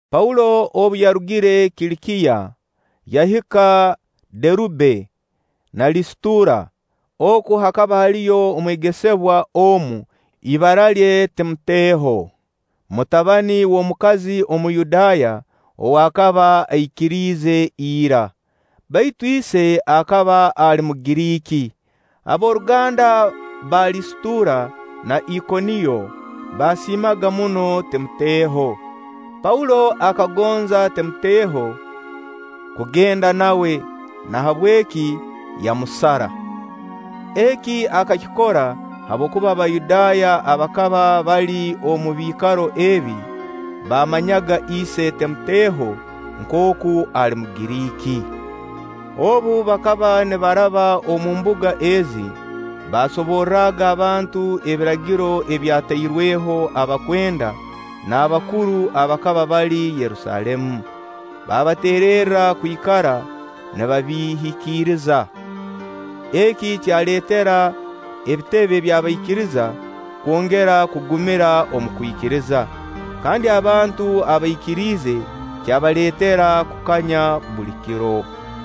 Paulo obu yarugire Kilikiya, yahika Derube na Lisitura. Oku hakaba haliyo omwegesebwa omu, ibara lye Timoteo, mutabani w'omukazi Omuyudaaya ow'akaba aikiriize ira; baitu ise akaba ali Mugiriiki. Ab'oruganda ba Lisitura na Ikoniyo baasiimaga muno Timoteho. Paulo akagonza Timoteho kugenda nawe; nahabweki yamusara. Eki akakikora habwokuba Abayudaaya abakaba bali omu biikaro ebi, baamanyaga ise Timoteho nkooku ali Mugiriiki. Obu bakaba nibaraba omu mbuga ezi, baasoborraga abantu ebiragiro ebyatairweho abakwenda n'abakuru abakaba bali Yerusaalemu, baabateererra kwikara nibabihikiriza. Eki kyaleetera ebitebe by'abaikiriza kwongera kugumira omu kwikiriza, kandi abantu abaikiriize kyabaleetera kukanya buli kiro.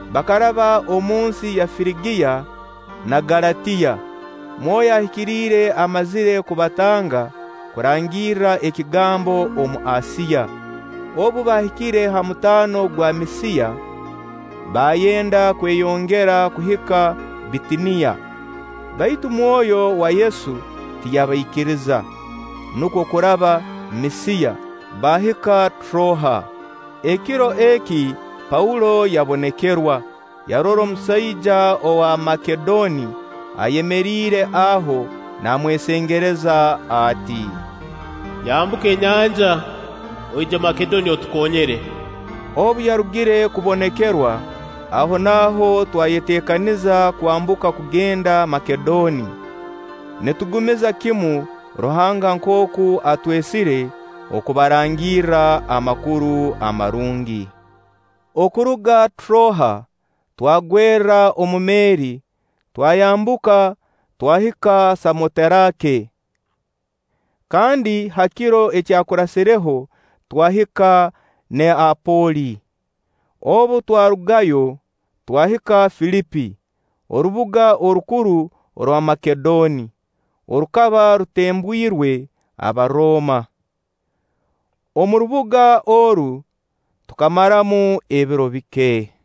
Bakaraba omu nsi ya Firigiya na Galatiya, Mwoyo Ahikiriire amazire kubatanga kurangirra ekigambo omu Asiya. Obu baahikire ha mutaano gwa Misiya, baayenda kweyongera kuhika Bitiniya, baitu Mwoyo wa Yesu tiyabaikiriza; nukwo kuraba Misiya, baahika Troa. Ekiro eki Paulo yabonekerwa, yarora omusaija owa Makedoni ayemeriire aho naamwesengereza ati: “Yambuka enyanja, oije Makedoni, otukonyere.” Obu yarugire kubonekerwa, ahonaaho twayeteekaniza kwambuka kugenda Makedoni, nitugumiza kimu Ruhanga nkooku atwesire okubarangirra Amakuru Amarungi. Okuruga Troa twagwerra omu meeri, twayambuka, twahika Samoterake; kandi ha kiro ekyakurasireho twahika Neapoli. Obu twarugayo, twahika Filipi, orubuga orukuru rwa Makedoni, orukaba rutembwirwe Abarooma. Omu rubuga oru tukamaramu ebiro bike;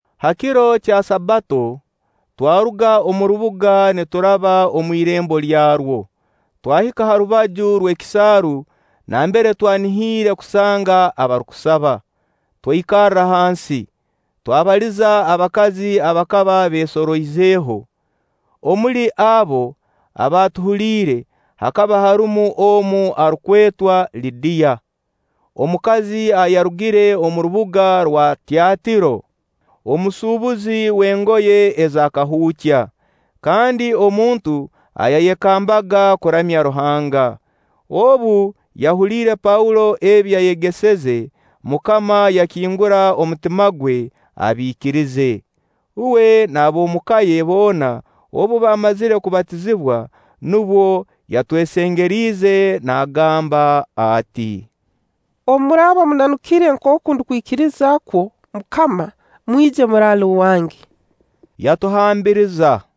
ha kiro kya Sabbato twaruga omu rubuga nituraba omu irembo lyarwo, twahika ha rubaju rw'ekisaaru nambere twanihiire kusanga abarukusaba. Twaikarra hansi, twabaliza abakazi abakaba beesoroizeho. Omuli abo abaatuhuliire hakaba harumu omu arukwetwa Lidiya, omukazi ayarugire omu rubuga rwa Tyatiiro, omusuubuzi w'engoye eza kahuukya, kandi omuntu ayayekambaga kuramya Ruhanga. Obu yahuliire Paulo ebi yayegeseze, MUKAMA yakingura omutima gwe, abiikirize. Uwe n'ab'omu ka ye boona obu baamazire kubatizibwa, nubwo yatwesengeriize naagamba ati: “Obu muraaba munanukire nkooku ndukwikiriza kwo MUKAMA, mwije muraale owange.” Yatuhambiriza.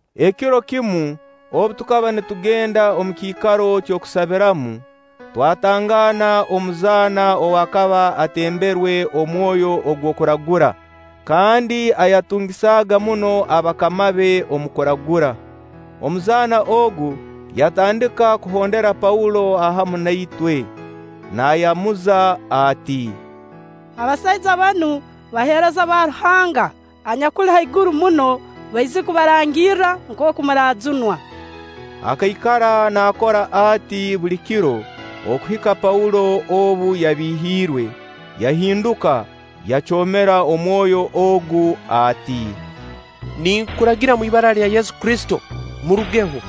Ekiro kimu obu tukaba nitugenda omu kiikaro ky'okusabiramu, twatangaana omuzaana ow'akaba atemberwe omwoyo ogw'okuragura, kandi ayatungisaaga muno bakama be omu kuragura. Omuzaana ogu yatandika kuhondera Paulo hamu na itwe, naayamuza ati: “Abasaija banu, baheereza ba Ruhanga anyakuli haiguru muno, baizire kubarangirra nkooku muraajunwa.” Akaikara naakora ati buli kiro okuhika Paulo obu yabiihiirwe, yahinduka yacoomera omwoyo ogu ati: “Ninkuragira omu ibara lya Yesu Kristo, murugeho.”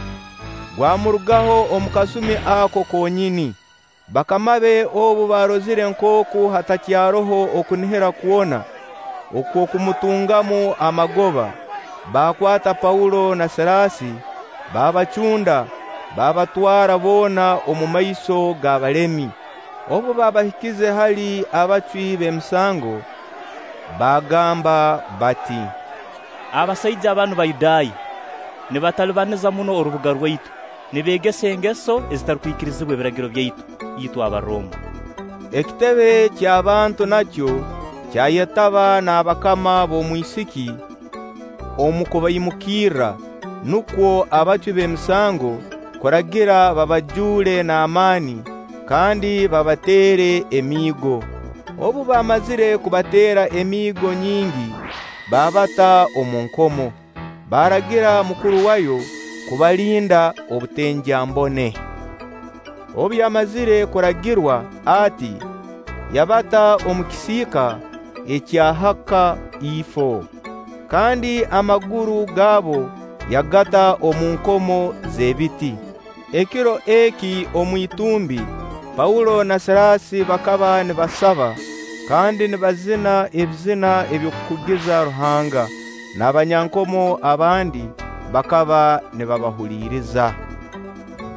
Gwamurugaho omu kasumi ako konyini. Bakama be obu baarozire nkooku hatakyaroho okunihira kwona okw'okumutungamu amagoba, baakwata Paulo na Siraasi, baabacunda, baabatwara booma omumaiso g'abalemi. Obu baabahikize hali abacwi b'emisango, baagamba bati: “Abasaija banu Bayudaaya, nibatalibaniza muno orubuga rwaitu, nibeegesa engeso ezitarukwikirizibwa ebiragiro byaitu, itwe Abarooma.” Ekitebe ky'abantu nakyo kyayetaba n'abakama b'omwisiki omu kubaimukirra, nukwo abacwi b'emisango kuragira babajuule n'amaani kandi babateere emiigo. Obu baamazire kubateera emiigo nyingi, baabata omu nkomo, baaragira mukuru waayo kubalinda obutengyambone. Obu yamazire kuragirwa ati, yabata omu kisiika ekya ha kaifo, kandi amaguru gaabo yagata mu nkomo z'ebiti. Ekiro eki omu itumbi, Paulo na Siraasi bakaba nibasaba kandi nibazina eby'okukugiza Ruhanga, n'abanyankomo abandi bakaba nibabahuliriza.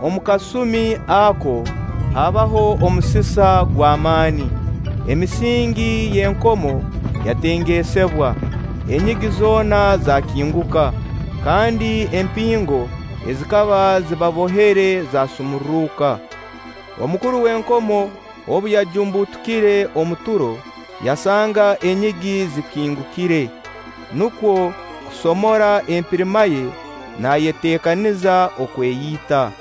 Omu kasumi ako haabaho omusisa gw'amaani, emisingi y'enkomo yatengesebwa, enyigi zoona zaakinguka, kandi empingo ezikaba zibabohere zaasumurruka. Omukuru w'enkomo obu yajumbutukire omu turo, yasanga enyigi zikingukire, nukwo kusomora empirima ye naayeteekaniza okweyita,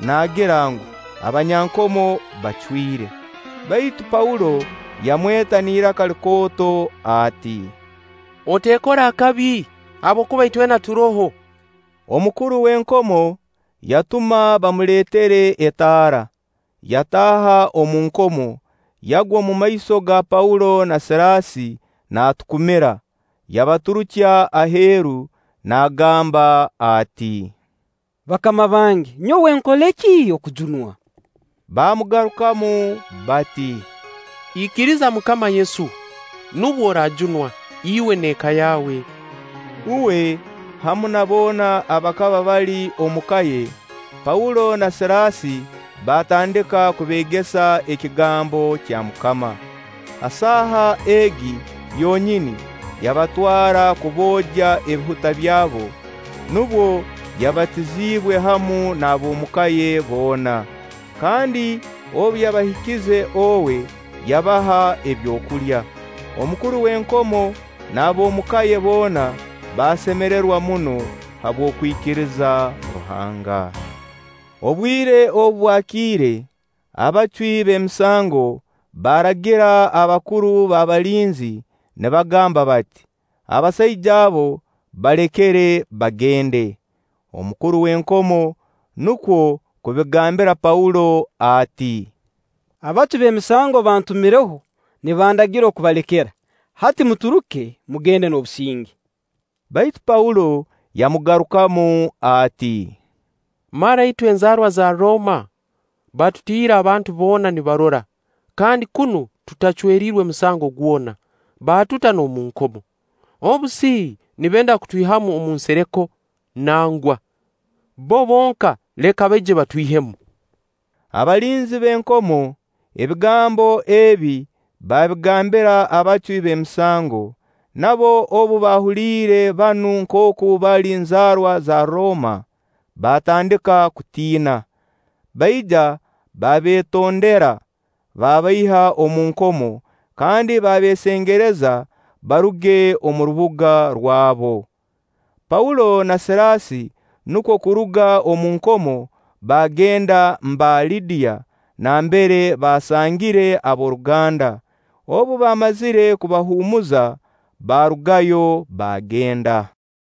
naagira ngu, abanyankomo bacwire. Baitu Paulo yamweta n'iraka likooto ati: “Oteekora akabi, habwokuba itwena turoho.” Omukuru w'enkomo yatuma bamuleetere etaara, yataaha omu nkomo, yagwa omumaiso ga Paulo na Siraasi naatukumira. Yabaturukya aheeru, naagamba ati: “Bakama bange, nyowe nkole ki okujunwa?” Baamugarukamu bati: “Ikiriza MUKAMA Yesu, nubwo oraajunwa, iwe n'eka yaawe.” Uwe hamu na boona abakaba bali omuka ye, Paulo na Siraasi baatandika kubeegesa ekigambo kya MUKAMA. Ha saha egi yonyini yabatwara kuboogya ebihuta byabo; nubwo yabatiziibwe hamu n'ab'omuka ye boona. Kandi obu yabahikize owe, yabaha ebyokulya. Omukuru w'enkomo n'ab'omu ka ye boona baasemererwa muno habw'okwikiriza Ruhanga. Obwire obu bwakiire, abacwi b'emisango baaragira abakuru b'abalinzi nibagamba bati: “Abasaija abo balekere, bagende.” Omukuru w'enkomo nukwo kubigambira Paulo ati: “Abacwi b'emisango bantumireho, nibandagira kubalekera; hati muturuke, mugende n'obusinge.” Baitu Paulo yamugarukamu ati: “Mara itwe enzaarwa za Rooma batutiire abantu boona nibarora, kandi kunu tutacweriirwe musango gwona, baatuta n'omu nkomo. Obu si nibenda kutwihamu omu nsereko? Nangwa! Bbo bonka leka baije batwihemu.” Abalinzi b'enkomo, ebigambo ebi baabigambira abacwi b'emisango. Nabo obu baahuliire banu nkooku bali nzaarwa za Rooma, baatandika kutiina; baija babetondera. Babaiha omu nkomo kandi babeesengereza baruge omu rubuga rwabo. Paulo na Siraasi nukwo kuruga omu nkomo, baagenda mba Lidiya nambere baasangire ab'oruganda. Obu baamazire kubahuumuza, baarugayo, baagenda.